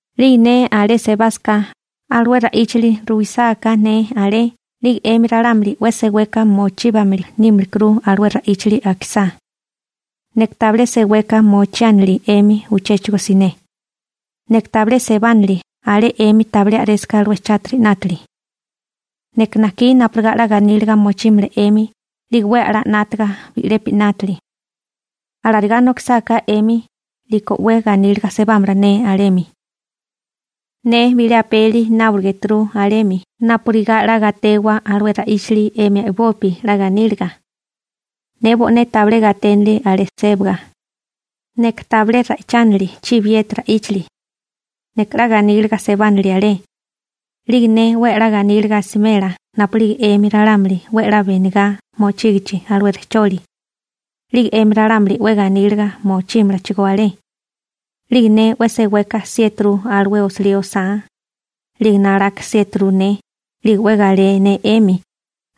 'Lige ne alé sebásaká, alué ra'íchali ruwisáká ne alé, 'lige 'emi ralámuli 'we seweka mochíbamili nímilikuru alué ra'íchali akisá. Neka tabilé seweka mochiánili 'emi uchéchigo siné. Neka tabilé sebánili alé 'emi tabilé a'résaká alué chátiri 'nátili. Neka najkí napurigá 'la ganíliga mochímala 'emi 'lige 'we a'lá 'nátaga bi'lepi 'nátili. Alarigá nokisáká 'emi, 'liko 'we ganíliga sebámala ne alemi. Ne bilé apeli nábolegéturu alé 'mi napurigá 'la gatewa alué ra'íchali 'emi a'bopi 'la ganíliga. Ne bo'né tabilé gaténili alé sébaga. Neka tabilé ra'ichánali chibiyeti ra'íchali. Neka 'la ganíliga sebánili alé. 'Lige ne 'we a'lá ganíliga asimela napu'lige 'emi ralámuli 'we a'lá benigá mochígichi alué rejcholi. 'Lige 'emi ralámuli 'we ganíliga mochímalachigó alé. 'Lige ne 'we seweka 'siéturu alué osilí osá, 'lige nalaka 'siéturu ne. 'Lige 'we galé ne 'emi,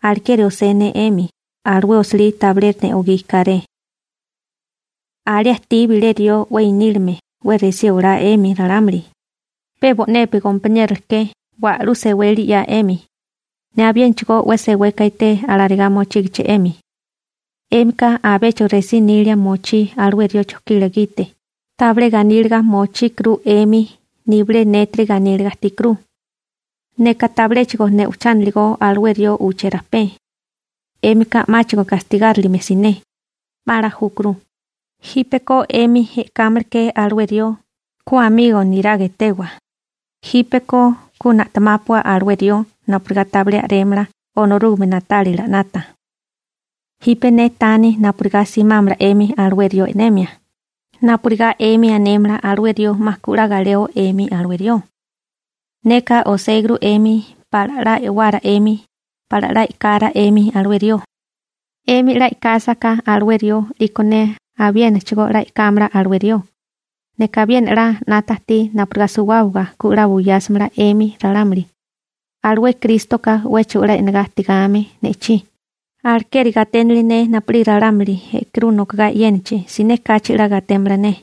alekeri osé ne 'emi. Alué osilí, tabilé ne'ogí kéré. Alé ajtí bilé rió 'we inílime 'we resí olá 'emi ralámuli, pe bo'nepi gompaniérola ke wa'lú seweli 'ya 'emi. Ne abiénachigó 'we seweka ajtí alarigá mochígichi 'emi. 'Émika abéchigo resí nilia mochí alué rió chojkila gite, tabilé ganíliga mochíkuru 'emi nibilé nétiri ganíliga ajtíkuru. Neka tabiléchigo ne'ochániligó alué rió uché rajpé. 'Émika 'máchigo gastigárilime siné. 'Ma 'la júkuru. Jípeko 'emi e'kámala ke alué rió, ku amigo niraga etewa. Jípeko ku na'temápua alué rió napurigá tabilé a'rémala Onorúgame na'tálila 'nata. Jipe ne taní napurigá simámala 'emi alué rió e'nemia, napurigá 'emi anémala alué rió 'ma ku 'la galeo 'emi alué rió. Neka oséguru 'emi pala 'la e'wara 'emi, pala 'la e'kara 'emi alué rió. 'Emi 'la e'kásaká alué rió 'liko ne abiénachigó 'la e'kámala alué rió. Neka abiena 'la 'nata ajtí napurigá suwábaga ku 'la ganíliga nokísimala 'emi ralámuli. Alué Krístoka 'wéchigo 'la e'negá ajtigame ne'chí, alekeri gaténili ne napu'lige ralámuli e'kurú nokogá e'yénachi, siné kachi 'la gatémala ne.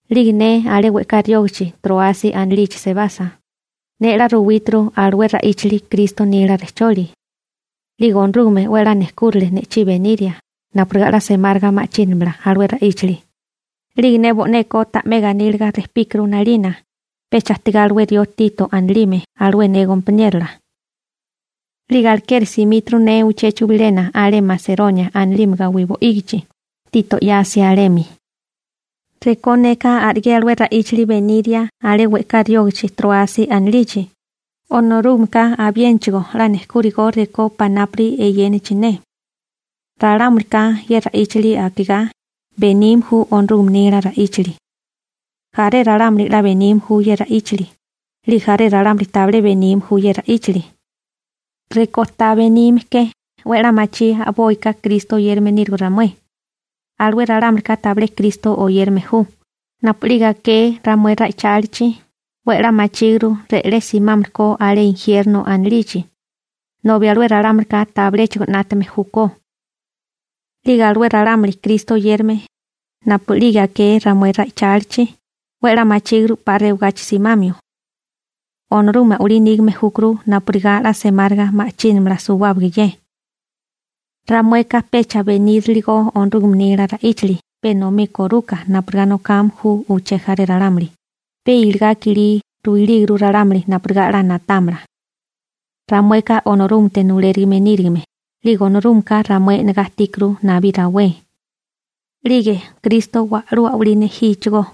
'Lige ne alé we'ká riógichi Tróasi anilichi sebasa, ne 'la ruwíturu alué ra'íchali Kristo nila rejcholi. 'Lige Onorúgame 'we a'lá nejkúrale ne'chí beniria napurigá 'la semáriga ma'chínamala alué ra'íchali. 'Lige ne bo'neko ta'mé 'we ganíliga rejpíkuru 'nalina, pecha ajtigá alué rió Tito anilime alué ne gompaniérola. 'Lige alekeri simíturu ne uchéchigo bilena alé Maseronia anilime gawí bo'ígichi, Tito 'yasia alemi. Rekó neka a'rigé alué ra'íchali beniria alé we'ká riógachi Tróasi anilichi, Onorúgameka abiénachigo 'la nejkúrigo rekó panápuri eyénachi ne. Ralámulika ye ra'íchali akigá, benime ju Onorúgame nila ra'íchali. Jaré ralámuli 'la benime ju ye ra'íchali, 'lige jaré ralámuli tabilé benime ju ye ra'íchali. Rekó ta benime ke, 'we 'la machí a'boika Kristo oyérame nírigo ramué. Alué ralámulika tabilé Kristo oyérame ju, napu'lige aké ramué ra'ichálichi, 'we a'lá machíguru re'lé simámili ko alé injierno anilichi, nobi alué ralámulika tabiléchigo 'nátame júkó. 'Lige alué ralámuli Kristo oyérame, napu'lige aké ramué ra'ichálichi, 'we 'la machíguru 'pa rewagachi simamio. Onorúgame a'walí nígame júkuru napurigá 'la semáriga ma'chínamala suwábaga ye. Ramueka pecha beníriligo Onorúgame nila ra'íchali pe enomí koruka napurigá nokame ju uché jaré ralámuli, pe iligá i'kilí ruilíguru ralámuli napurigá 'la na'támala. Ramueka Onorúgamete nulérigime nírigime, 'lige Onorúgameka ramué e'negá ajtíkuru nabí rawé. 'Lige Kristo wa'lú a'walí nejíchigó.